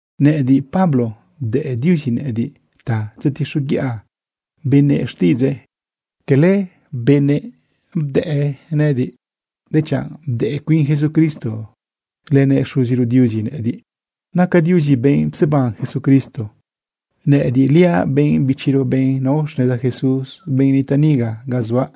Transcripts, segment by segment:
Nëꞌëdiꞌ, Pablo, bdëꞌ Diuzi nëꞌëdiꞌ ta tzetixoguiꞌa benëꞌ xtiꞌidzëꞌ. Cala benëꞌ bdëꞌ nëꞌëdiꞌ, dechanꞌ bdëꞌ cuin Jesucristo lënëꞌ Xuziro Diuzi nëꞌëdiꞌ. Naca Diuzi benꞌ pseban Jesucristo. Nëꞌëdiꞌliaꞌ benꞌ bichiro, benꞌ nao xneza Jesús, benꞌ nitaꞌ niga ga zuaꞌ,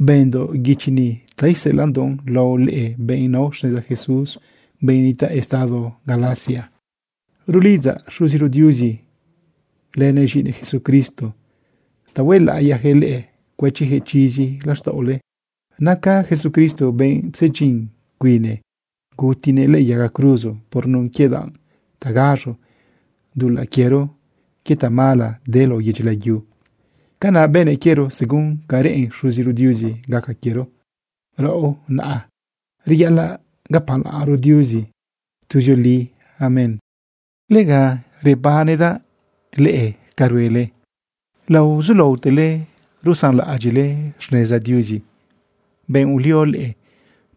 bëndoꞌ guichi ni ta iseꞌelaꞌndoꞌ lao leꞌe, benꞌ nao xneza Jesús, benꞌ nitaꞌ estado Galacia. Rulidzaꞌ Xuziro Diuzi lënëꞌ z̃iꞌinëꞌ Jesucristo ta huelaꞌiyaquëꞌ leꞌe cuëchiyaquëꞌ chizi laxtaꞌole. Naca Jesucristo benꞌ psedyin cuine gutinëꞌ lëꞌë yaga cruzo por nun quie danꞌ ta gaz̃o dulaꞌ quiero quie tamala de lao yedyi layu. Canaꞌ bënëꞌ quiero según ca reꞌen Xuziro Diuzi gaca quiero. ¡Raꞌo naꞌ, reyaꞌalaꞌ gapalaꞌnro Diuzi tuzioli! Amén. Lega rebanedaꞌ leꞌe ca ruele laozulaotele rusanlaꞌadyiꞌle xneza Diuzi, benꞌ ulio leꞌe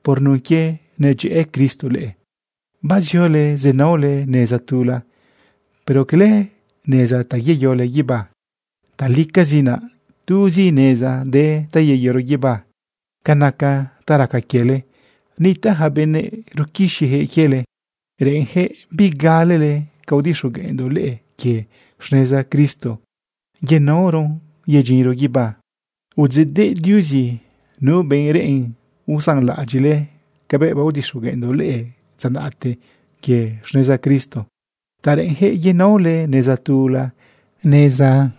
por nun quie nadyëꞌë Cristo leꞌe. Baziole zenaole neza tula, pero cala neza ta yeyole guibá. Talicazi naꞌ tuzi neza de ta yeyoro guibá. Ca naca ta raca quiele, nitaꞌ yaca benëꞌ ruquixiyaquëꞌ quiele. Reꞌenjëꞌ bigalele ca udixogueꞌndoꞌ leꞌe quie xneza Cristo yenaoron yedyinro guibá. Udzeꞌdeꞌ Diuzi nu benꞌ reꞌen usanlaꞌadyiꞌle cabëꞌ baodixogueꞌndoꞌ leꞌe dza naꞌte quie xneza Cristo ta reꞌenjëꞌ yenaole neza tula, neza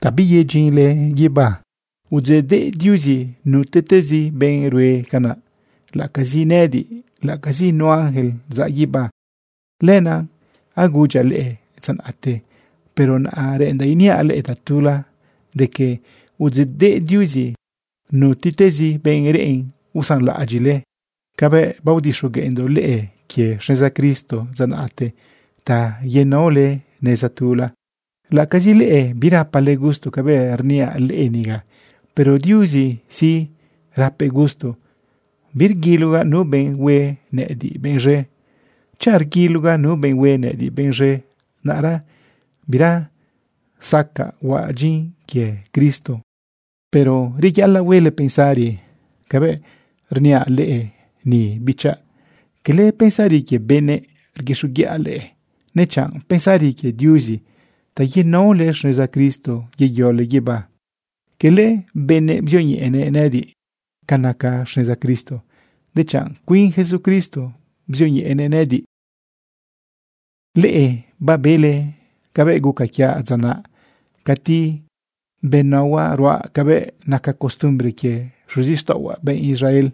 ta biyedyinle guibá. Udzeꞌdeꞌ Diuzi nutiꞌtezi benꞌ rue canaꞌ, laꞌacazi nëꞌëdiꞌ, laꞌacazi nu ángel zaꞌ guibá. Lenaꞌ agudyaꞌ leꞌe dza naꞌte, pero naꞌa reꞌendaꞌ iniaꞌ leꞌe tatula de que udzeꞌdeꞌ Diuzi nutiꞌtezi benꞌ reꞌen usanlaꞌadyiꞌle cabëꞌ baodixogueꞌndoꞌ leꞌe quie xneza Cristo dza naꞌte ta yenaole neza tula. Laꞌacazi leꞌe birapale gusto cabëꞌ rniaꞌ leꞌe niga, pero Diuzi sí, rapëꞌ gusto. Birguilogaꞌ nu benꞌ hue nëꞌëdiꞌ benꞌ z̃e. Chanꞌ rguilogaꞌ nu benꞌ hue nëꞌëdiꞌ benꞌ z̃e, naꞌra bira zacaꞌ huaꞌ dyin quie Cristo. Pero reyaꞌalaꞌ huele pensari cabëꞌ rniaꞌ leꞌe ni, bichaꞌ. Cala pensari quie benëꞌ rguixoguiꞌa leꞌe, dechan pensari quie Diuzi ta yenaole xneza Cristo yeyole guibá. Cala benëꞌ bzioñeꞌenëꞌ nëꞌëdiꞌ ca naca xneza Cristo, dechanꞌ cuin Jesucristo bzioñeꞌenëꞌ nëꞌëdiꞌ. Leꞌe babele cabëꞌ guca quiaꞌ dza naꞌ cati benaohuaꞌ ruaꞌ cabëꞌ naca costumbre quie xuzixtaꞌohuaꞌ benꞌ Israel.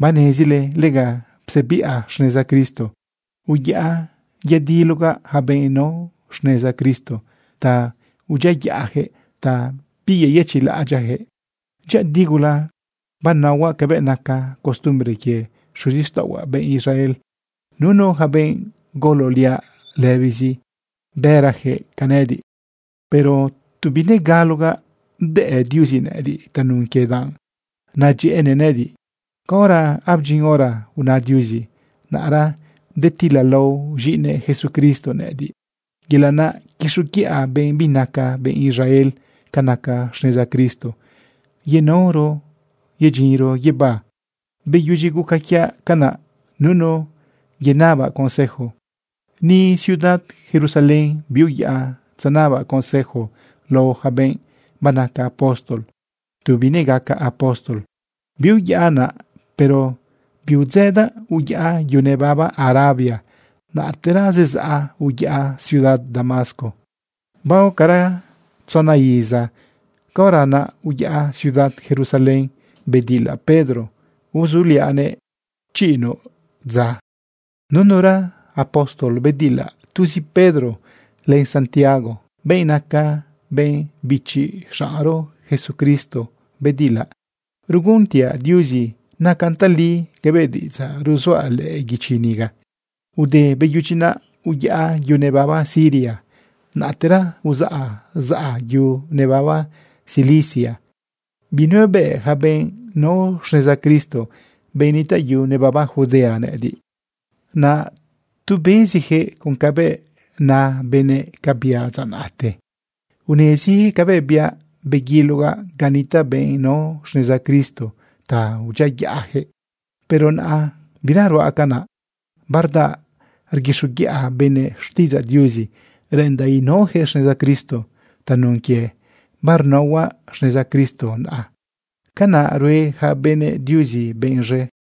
Banezile lega psebiꞌa xneza Cristo. Uyaꞌa yadilogaꞌ yaca benꞌ nao xneza Cristo ta udyiayaꞌyaquëꞌ, bibeyëchiꞌlaꞌadyaꞌyaquëꞌ. Dyëꞌëdi gula benaohuaꞌ cabëꞌ naca costumbre quie xuzixtaꞌohuaꞌ benꞌ Israel. Nunu yaca benꞌ gololiaꞌ lëbizi, bërayaquëꞌ ca nëꞌëdiꞌ. Pero tu binegalogaꞌ bdëꞌ Diuzi nëꞌëdiꞌ tanun quie danꞌ nadyëꞌënëꞌ nëꞌëdiꞌ. Caora abdyin hora una Diuzi, naꞌra bedetilalao z̃iꞌinëꞌ Jesucristo nëꞌëdiꞌ, yelaꞌ naꞌ quixoguiꞌa benꞌ binaca benꞌ Israel ca naca xneza Cristo yenaoron yedyinro guibá. Beyudyi guca quiaꞌ canaꞌ, nunu yenabaꞌ consejo. Ni ciudad Jerusalén biuyaꞌa tzenabaꞌ consejo lao yaca benꞌ banaca apóstol tu binegacaꞌ apóstol. Biuyaꞌa naꞌ, pero biudzëdaꞌ uyaꞌa yu nebaba Arabia. Naꞌtera zezaꞌa uyaꞌa ciudad Damasco. Baocara tzona iza, caora naꞌ uyaꞌa ciudad Jerusalén bedilaꞌ Pedro uzuliaꞌnëꞌ chiꞌinuꞌ dza. Nunura apóstol bedilaꞌ. Tuzi Pedro len Santiago, benꞌ naca benꞌ bichi xaꞌnro Jesucristo, bedilaꞌ. Ruguntiaꞌ Diuzi nacan tali cabëꞌ diꞌidzaꞌ ruzuaꞌ lëꞌë guichi niga. Ude beyudyi naꞌ, uyaꞌa yu nebaba Siria. Naꞌtera uzaꞌ zaꞌa yu nebaba Cilicia. Binuebëꞌ yaca benꞌ nao xneza Cristo, benꞌ nitaꞌ yu nebaba Judea, nëꞌëdiꞌ. Naꞌ tu beziyaquëꞌ con cabëꞌ na benëꞌ ca biaꞌ dza naꞌte. Uneziyaquëꞌ cabëꞌ biaꞌ beguilogaꞌ ga nitaꞌ benꞌ nao xneza Cristo ta udyiayaꞌyaquëꞌ. Pero naꞌa bira ruaꞌ canaꞌ, bardaꞌ rguixoguiꞌa benëꞌ xtiꞌidzaꞌ Diuzi reꞌendaꞌ inaoyaquëꞌ xneza Cristo. Tanun quie barnaohuaꞌ xneza Cristo naꞌa, canaꞌ rue yaca benëꞌ Diuzi benꞌ z̃e.